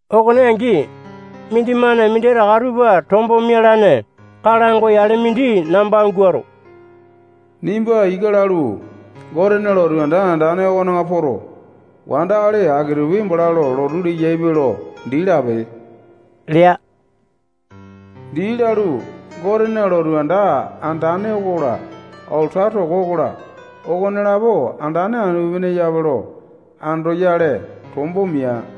Okone angi, mindimane minditaka tupa tombo mialane kalango yale mindi namba guato, nimba ika lalu, Gotena lotu anda andane okona poto, wandakali aki-tupi bala lo lotu leyaipe lo dii lape lea. Dii lalu, Gotena lotu anda andane okola, alata toko okola, okonelapo andane anu-pene eyape lo andoyale tombo mia.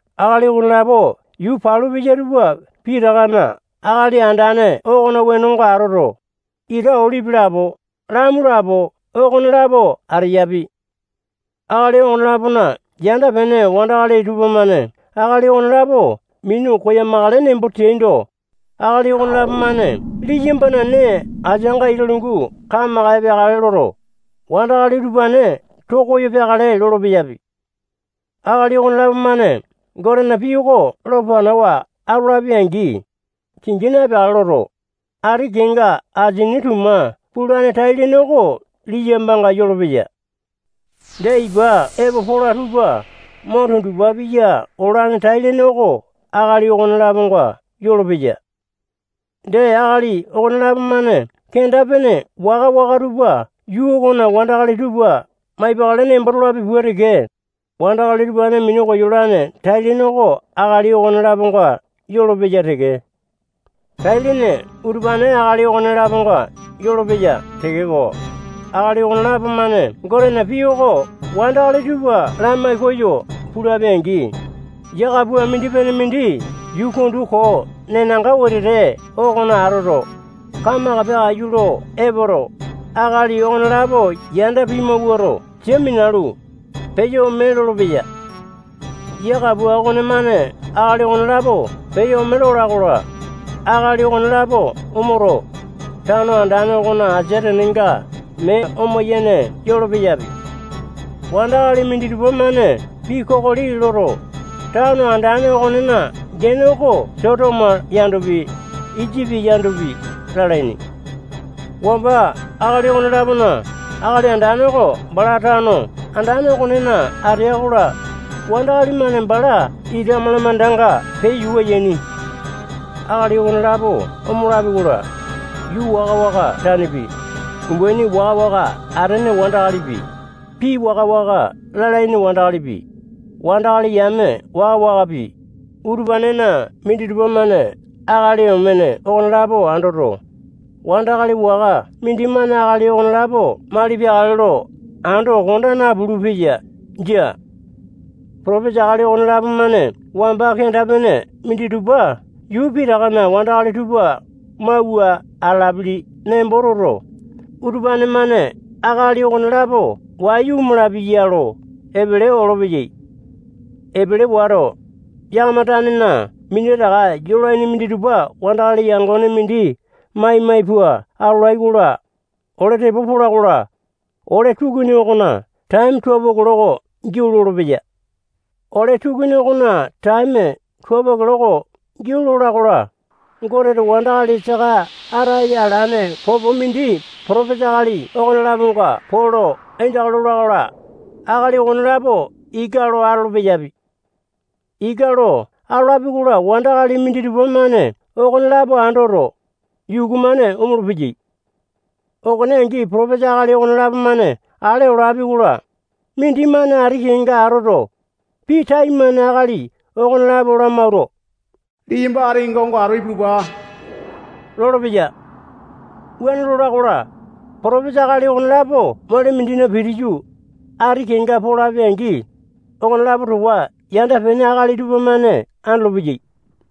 Akali okonelapo yuu palu peya tupa pitakana Akali Andane okona wenonga atoto, ita olipi lapo, lamu lapo, okonelapo ateyapi. Akali okone-lapona yanda-pene wandakali tupamane akali okonelapo minu koyamakale nembo teaindo, akali okonelapo-mane liyambana nee asianga ita lungu kamaka epeakale loto, wandakali utupane too koyo peakale lolo-peyapi. Akali okonelapo-mane Gotena pii oko lo panawa atolapi-angi, kingi na-epeakale loto, ati kenga asini tuma pulane tai-lene oko liyambanga yolopeya. Dee, ipa epo pola tupa mo tundupa piya olane tai-lene oko akali okone-laponga yolopeya. Dee, akali okonelapo-mane kenda-pene waka-waka tupa yuu okona wandakali tupa maipakale nembo tolapi pua teke, wandakali utupane minu koyolane tai-lene oko akali okone-laponga yolopeya teke. Tai-lene utupane akali okone-laponga yolopeya tekeko, akali okonelapo-mane Gotena pii oko wandakali tupa lamai koyo pulapi-angi, yia kapua mindi-pene mindi yuu kundu koo nenanga wetete okona atoto, kamaka peakaiyu lo epoto, akali okonelapo yanda pimawuato, sia minalu, peyo ome lolopeya. Yia kapua okonemane akali okonelapo peyo ome lola-kola, akali okonelapo omoto, tano andane okona asia tenenga mee oma-yene yolo-peyapi. Wandakali minditupa-mane pii kokoli loto, tano andane okonena gene oko Sotomo yandopi, Isipi yandopi, lalaini. Wamba akali okone-lapona Akali Andane oko bala tano andane okonena atea-kola, wandakali-mane bala ita malamandanga peyo yuku yaini. Akali okonelapo omolapi-kola, yuu waka-waka tanepi, umbaini waka-waka atene wandakalipi, pii waka-waka lalaini wandakalipi, wandakali yame waka-wakapi, utupanena minditupa-mane akali omene okonelapo andoto, wandakali waka mindimane akali okonelapo mali peakale lo ando konda napulu-peya. Jia. Potopesa akali okonelapo-mane wamba kenda-pene minditupa yuu pitakana wandakali tupa mauwa atalapili nembo toto, utupane-mane akali okonelapo wayu omalapi ya lo epele olopeyai. Epele wato, yakama tanena minditaka yolaini minditupa wandakali yangone mindi mai-mai pua atolai-kola, ole tepo pola-kola, ole tukuni okona taeme tualo kiloko giau lolopeya. Ole tukuni okona taeme tualo kiloko giau lola-kola, Goteto wandakali saka ataya alane popo mindi potopesa akali okone-laponga poo lo aindaka lola-kola, akali okonelapo ika lo atolo-peyapi. Ika lo atolapi-kola, wandakali minditupa-mane okonelapo andoto, yuku-mane omolo-peyai. Okone angi, potopesa akali okonelapo-mane ale olapi-kola, mindimane ati kenga atoto, pii taimane akali okonelapo lamawuato, liyamba ati kenga onga ipulupa lolopeya. Wuane lola-kola, potopesa akali okonelapo mole mindina pitiyu, ati kenga polapi-angi, okonelapo towa yanda-pene akali tupamane andolopeyai.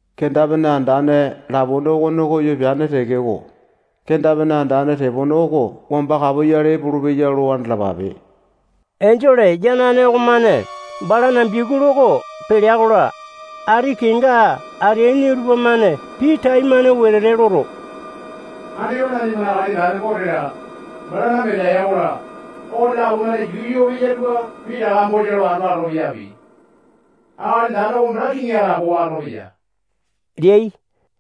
Kenda-pene andane lapone okone koyo peane tekeko, kenda-pene andane tepone oko wamba kapoyale epolopeya lo andalapape. Enjole yanane okomane balana biakulu oko pelea-kola, ati kenga ateaini tupamane pii taimane wetete loto, andipa nanimana Akali Andane Gote-la, balana Mesaya okola, okonelapo-mane yuu yoo peya tupa pitaka bosa lo ando atolo-peyapi. Akali Andane oko bala kiŋi atapowa atolopeya leai.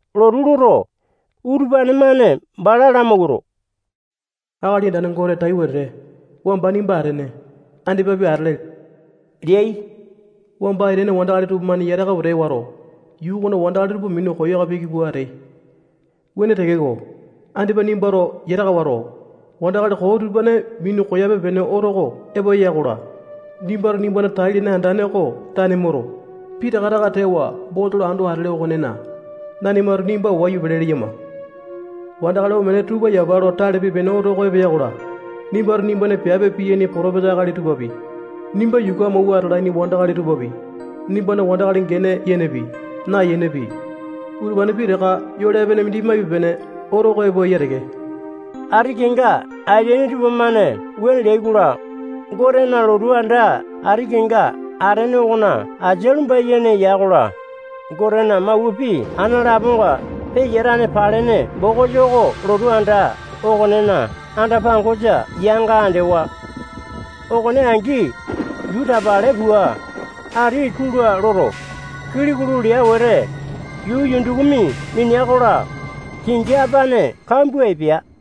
Lotu loto, utupane-mane bala lamawuato, Akali Andane Gote tai wetete, wamba nimba atene, andipapi atele leai. Wamba aitene wandakali tupamane yataka wete wato, yuu okona wandakali tupa minu koyaka piki pua ateai. Wuane tekeko, Andipa nimbato yataka wato, wandakali koo utupane minu koyape-pene oto oko epo eya-kola, nimbato nimbana tai-lene andane oko tane moto, pitaka taka tewa bosa lo ando atele okonena, nanimato nimba wayu pele leyama. Wandakali omene tupa yapa lo tale pipe-pene oto oko epo eya-kola, nimbato nimbana piape piyaini potopesa akali tupapi, nimba yuku amawua atalaini wandakali tupapi, nimbana wandakali gene yenepi, nayenepi, utupane pitaka yole epene mindi maipe-pene oto oko epo eya teke. Ati kenga ateaini tupamane wuane leai-kola, Gotena lotu anda ati kenga atene okona asia lumba-yene ya-kola, Gotena mawua pii ana laponga peyatane palene bokisa oko lotu anda okonena anda-pangosa yanga andewa. Okone angi, yuu tapale pua, ati tula loto, kili kulu lea wete, yuu yundukumi minea-kola, kingi apane kambua epea.